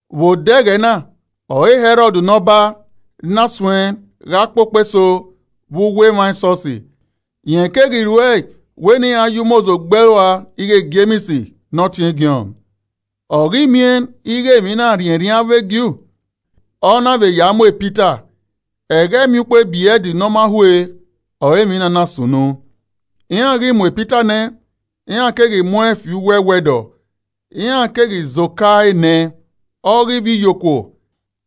Vbe odẹ ẹghẹ na ọre Hẹrọd ne Ọba na suẹn gha kpokpo eso vbe uwu emwa esọsi. Rẹn keghi ruẹe wẹ ne iran ya umozo gbe ẹe rua ighẹ Jems ne ọtiẹn Jọn. Ọ ghi miẹn ighẹ emwi na rhiẹnrhiẹn avbe ju, ọ na vbe ya mu Pita. (Ẹghẹ Emwiukpo ebrẹd Ne ọ ma hue ọre emwi na na sunu.) Iran ghi mu Pita nẹ, iran keghi mu ẹn fi uwu ẹwẹdọ, iran keghi zẹ oka enẹ ọghe ivbiyokuo,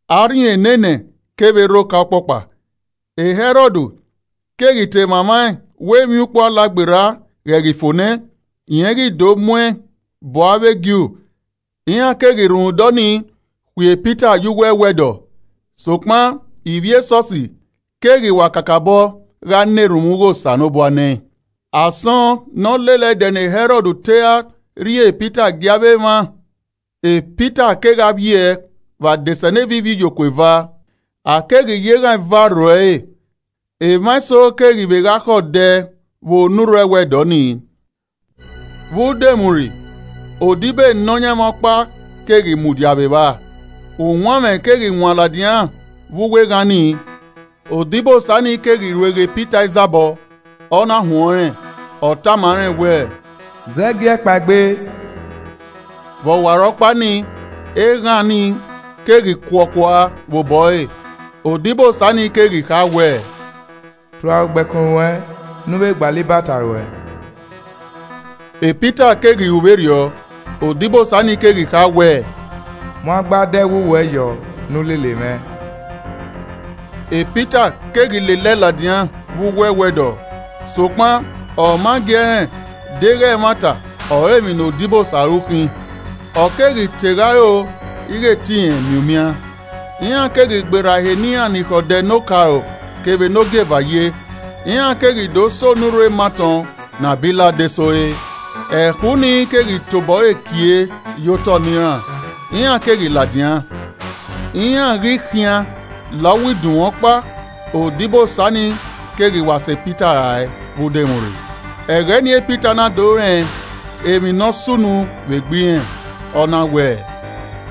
arhin enenẹ kevbe rre oka ọkpọkpa. Hẹrọd keghi te mwamwaẹn wẹ emwiukpo Alagberra ghẹ ghi fo nẹ, rẹn ghi do muẹn bu avbe Ju. Iran keghi rhunmwuda ọnii khui e Pita ye uwu ẹwẹdọ sokpan ivbi e esọsi keghi wa kakabọ gha na erhunmwu ghe Osanobua nẹẹn. Asọn ne ọ lele ẹdẹ ne Hẹrọd te ra rhie Pita gie avbe emwa, Pita kegha vbiẹ vbe adesẹneva ivbiyokuo eva. A keghi ya eghan eva rro ẹre, emwa eso keghi vbe gha khẹ odẹ vbe onurho ẹwẹdọ nii. Vbe udomwurri, odibo e Nọyaẹnmwa ọkpa keghi mudia vbe evba, uwanmwẹ keghi wan ladian vbe uwu eghan nii. Odibosa nii keghi rueghe Pita izabọ, ọ na huẹn ọnrẹn, ọ tama rẹn wẹẹ, “Zẹgiẹgiẹ! Kpaegbe!” vbe ọwarọkpa nii, eghan ni keghi kuọ kua vbe obọ ẹre. Odibosa nii keghi kha wẹẹ, “Tua ugbẹkun ruẹn ne u vbe gbalọ ibata ruẹ.” Pita keghi ru vberriọ, odibosa nii keghi kha wẹẹ, “Mu agbada ẹwu ruẹ yọ ne u lele mwẹ.” Pita keghi lele ẹe ladian vbe uwu ẹwẹdọ sokpan ọ ma gi ẹe rẹn deghẹ ẹmwata ọre emwi ne odibosa ru khin, ọ keghi te gha ro ighẹ te irẹn miẹn umian. Iran keghi gberra ehe ne iran ni khẹ odẹ ne okaro kevbe ne ogieva ye, iran keghi do sẹ onurho ematọn ne a bi la adesẹ ore. Ẹkhu ni keghi tobọ ẹre kie ye otọ ne iran, iran keghi ladian. Iran ghi khian la uwu idunmwu ọkpa, odibo Osa ni keghi wa sẹ Pita rae vbe udomwurri. Ẹghẹ nii Pita na do rẹn emwi ne ọ sunu vbe egbe irẹn, ọ na wẹẹ,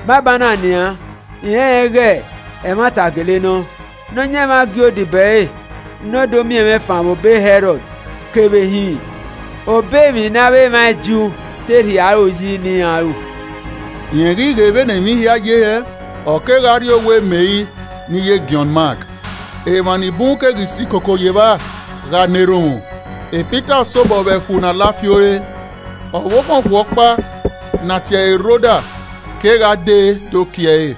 “Banbanna nian, I rẹnrẹn ighẹ ẹmwata gele nọ, Nọyaẹnmwa gie odibo ẹre ne ọ do miẹn mwẹ fan vbe obọ Hẹrọd kevbe hin obọ emwi ne avbe emwa e Ju te rhie aro yi ne iran ru.” Rẹn ghi ghe vbene emwi hia ye hẹ. ọ kegha rrie owa Meri ne iye Jọn Mak, Emwa ni bun keghi si koko ye evba gha na erhunmwu. Pita sobọ vbe ẹkhu ne a la fi ore, ọvbokhan okhuo ọkpa ne a tie ẹre Roda kegha dee do kie ẹre.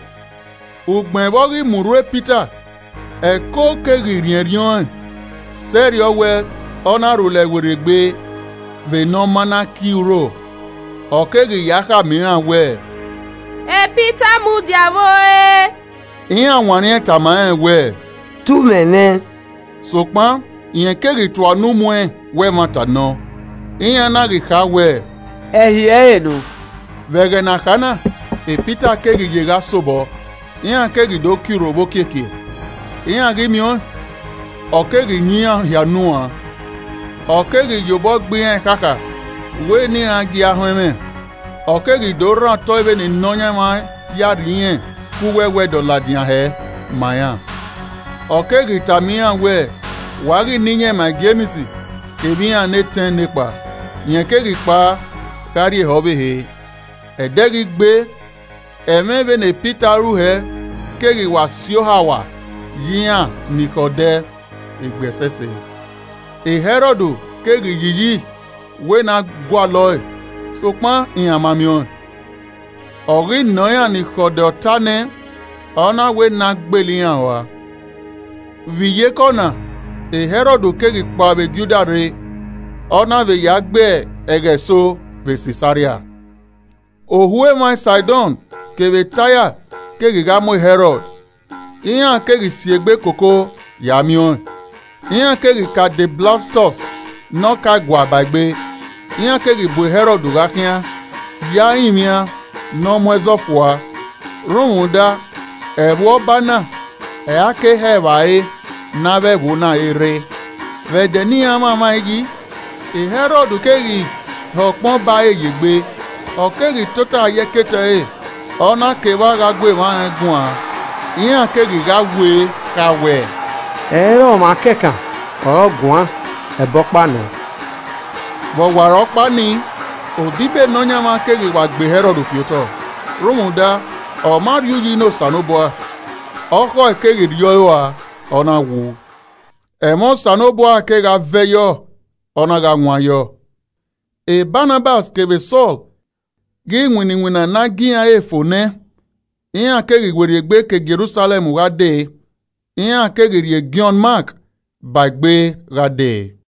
Ugbẹn vbe ọ ghi mu urhu e Pita, ẹko keghi rhiẹnrhiẹn ọẹn sẹrriọ wẹ ọ na rhulẹ werriegbe vbe ne ọ ma na kie urho, Ọ keghi ya kha ma iran wẹ, “Pita mudia vbe ore.” Iran wanniẹn tama rẹn wẹẹ, “Te u mwẹmwẹ.” Sokpan rẹn keghi tua unu muẹn wẹ ẹmwata nọ. Iran na ghi kha wẹ, “Ẹhi ẹre nọ.” Vbe ẹghẹ ne a kha na, Pita keghi ye gha sobọ. Iran keghi do kie urho vbe okiekie, iran ghi miẹn ọẹn, ọ keghi yan iran hia unu uan. Ọ keghi ye obọ gbe iran ekhakha wẹ ne iran gie a họn ẹmwẹ ọ keghi do rhan otọ vbene Nọyaẹnmwa ya rhie irẹn ke uwu ẹwẹdọ ladian hẹ ma iran. Ọ keghi tama iran we wa ghi na iyẹn ma Jems kevbe iran ne etẹn nekpa. Rẹn keghi kpao gha rrie ehe ọvbehe. Ẹdẹ ghi gbe, ẹmwẹ vbene Pita ru hẹ keghi wa si ohawa ye iran ni khẹ odẹ egbe ẹsẹse. Hẹrọd keghi yi iyi wẹ ne a gualọe, sokpan iran ma miẹn ọẹn, ọ ghi nọ iran ni khẹ odẹ ọta nẹ, ọ na wẹ ne a gbele iran uan. Vbe iyeke ọna Hẹrọd keghi kpao vbe Judia rre ọ na vbe ya gbe ẹghẹ eso vbe Sisaria. Ohu emwa Saidọn kevbe Taia keghi gha mu Hẹrọd, iran keghi si egbe koko ya miẹn ọẹn. Iran keghi ka de Blastọs ne ọka ẹguae ba egbe. Iran keghi bu Hẹrọd gha khian ya rinmwian ne ọ mu ẹzọ fua rhunmwuda, ẹvbo Ọba na ọre a ke hẹ evbare ne avbe ẹvbo na re rre. Vbe ẹdẹ ne iran mwamwaẹn yi, e Hẹrọd keghi hẹ ukpọn ọba ẹre ye egbe, ọ keghi tota ye ẹkete ẹre, ọ na ke evba gha gu emwa rẹn guan. Iran keghi gha kha wẹẹ, “Ẹ i re ọmwa kẹkan ọre ọ guan ẹbọ ọkpa nọ.” Vbe ọwarọkpa nii, odibo Nọyaẹnmwa keghi wa gbe Hẹrọd fi otọ rhunmwuda ọ ma rhie uyi ne Osanobua, ọkhọe keghi rriọ rua, ọ na wu. Ẹmwẹ Osanobua kegha vẹ yọ, ọ na gha wan yọ. Banabas kevbe Sọl ghi winna iwinna ne a gie iran ẹre fo nẹ, iran keghi werriegbe ke Jerusalẹm gha dee, iran keghi rhie Jọn Mak ba egbe gha dee.